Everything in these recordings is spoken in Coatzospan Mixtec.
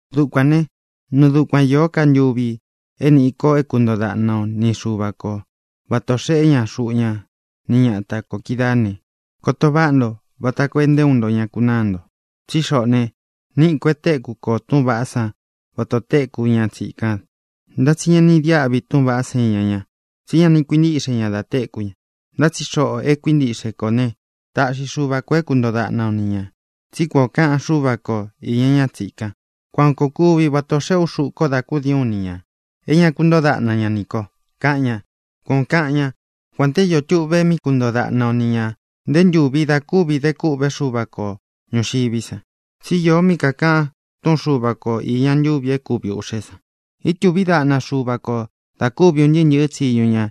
Dukuān né, nɨɨ dukuan īó ka ntuvi é nīꞌi ko é kuntoo daꞌna o ni Xuva ko vatā o xeꞌe ña xuꞌu ñá ni ñata kō kídaā ne, koto váꞌa nto vata koo é nté uun nto ña kunáa nto. Tsí xoꞌō ne, níꞌi kō e téku kō túꞌūn vaꞌá san vata ō téku ña tsīkan. Ntá tsi ña ni idiáꞌvi túꞌūn vaꞌá san iña ña, tsí ña ni kuintíꞌxe ña da téku ña. Ntá tsi xoꞌō e kuíntiꞌxe kō ne, táꞌxi Xuva kō é kuntoo daꞌna o ni ñā. Tsí kuan ō kaꞌan Xúva ko īña ñá tsīkan: Kuān koo kuví, vata ō xeꞌé u xuꞌu ko dá kudiín u ni ñā, é ña kúntoo daꞌna ña nī ko, kaꞌan ña. Kuan ō kaꞌan ñá, kuān te ió tuꞌve mí kuntoo daꞌna o ni ñā nté ntūvi da kúvi de kûꞌvé Xuva ko ñūxiví san. Tsi íō mí kākaꞌan túꞌūn Xuva ko īña ntuvi é kuvi ūꞌxé san: Ítūví daꞌna Xuva kō da kúvi un ntɨɨ́ ntɨ̄ɨ́ tsiñu ña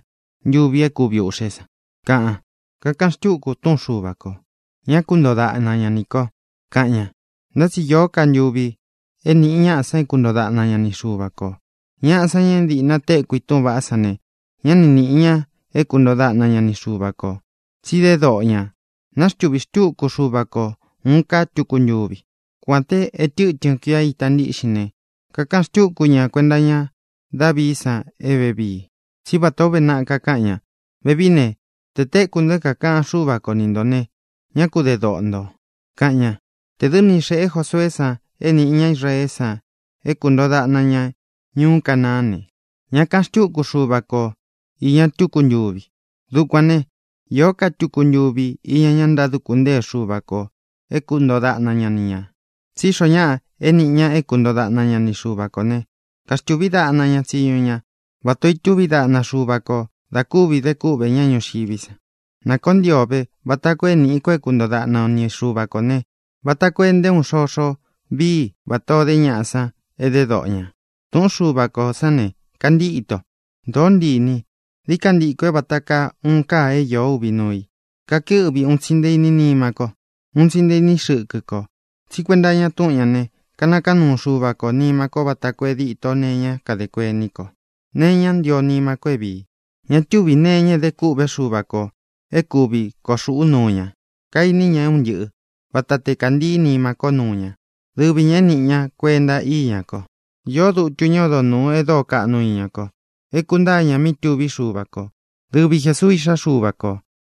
ntuvi é kuvi ūꞌxé san, kaꞌan. Kakaꞌan xtúku túꞌun Xuva kō: Ñá kuntoo daꞌna ña nī ko, kaꞌan ña. Ntá tsi īó ka ntuvi é nīꞌi ñaꞌa san é kuntoo daꞌna ña ni Xuva kō. Ñaꞌa san, ña é dīꞌna téku i túꞌūn vaꞌá san ne, ñá ni nīꞌi ña é kuntoo daꞌna ña ni Xuva kō, tsi dé doꞌo ñā. Nāxtuví xtuku Xuva ko ūun ká tuku ntuvi. Kuān té e tɨ́tɨn kuia ita ntíꞌxin ne, kakaꞌan xtúku ña kuenta iña Dávií san é vevii. Tsí vatā ó uve naꞌa kakáꞌan ña: Vevií ne, te tēku nto é kākaꞌan Xúva ko ni ntō ne, ñá ku de doꞌo ntō, kaꞌan ña. Tē dɨ́ ni xēꞌé Josueé san é nīꞌi ña Israeé san é kūntoo daꞌna ña ñuú Canaán ne, ñá kāꞌan xtúku Xuva ko īña tuku ntúvi. Dukuān né, īó ka tuku ntuvi iña ña ntáduku ntée Xuva kō é kuntoo daꞌna ña ni ñā. Tsí xoo ñáꞌa é nīꞌi ña é kuntoo daꞌna ña ni Xuva kō ne, kaxtuví daꞌna ña tsiñu ña vatā o itúvi daꞌna Xuva kō da kúvi de kúꞌvē ñá ñuxiví san. Na koo ntii o vē, vata koo é nīꞌi ko é kuntoo daꞌna o ni Xuva kō ne, vata koo e nté uun xoxo vií i vatā o dé ñaꞌa san e dé doꞌo ñā. Tūꞌún Xuva kō sán ne, kantíto. Dōó ntii īni i. Dií ka ntikō é vāta kaa uun káa é īó uvi núu i. Kakɨ́ꞌvi un tsi nté īní nima ko, un tsi nté īní xɨkɨ kō. Tsí kuenta iña túꞌun ñā ne, kanakaán nuu Xuva kō nima ko vata koo e díto nee iñá kadē kuení kō, nee iñá ntio nima ko é vīi. Ña túvī nee iña é de kûꞌvé Xuva kō é kuvi koo xūꞌú nuu ña. Kaini ña é un ntɨꞌɨ̄. Vata te kāntɨɨ́ nima ko núu ña, dɨvi ñā é nīꞌi ña kuenta íña ko. Īó dutu ñá odo nūu e dóo kaꞌnu ña iña ko, é kūntáa ña míꞌi tuví Xuva kō: dɨvi Jēsuu, Iꞌxá Xuva kō.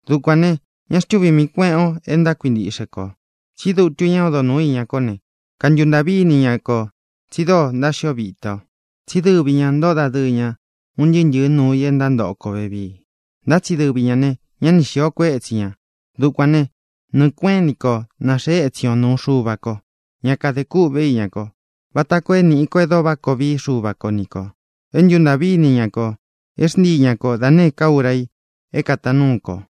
Dukuān ne, ñá xtuvī mii kuéꞌen ō e ntákuintiꞌxe kō. Tsí dutu ñá odo nūú iña kó ne, kantuntāꞌví ini ña kō tsi dóo ntáxio vita ō. Tsí dɨvi ñā ntóꞌo dadɨɨ ña un ntɨɨ́ ntɨ̄ɨ́ nuu i e ntántoꞌo kō vevii, ntá tsi dɨvi ñā ne, ñá ni xīo kuétsi ñā. Dukuān né, nɨɨ̄ kuéꞌen ini ko na xēe étsin ō nuu Xuva ko, ñá kadē kûꞌvé iña ko, vata koo é nīꞌi ko é dóo váꞌa koo vií Xuva ko ni kō, é ntuntāꞌví ini ña kō, é xntii ña ko da nēé ka ura i é kātaan núu kō.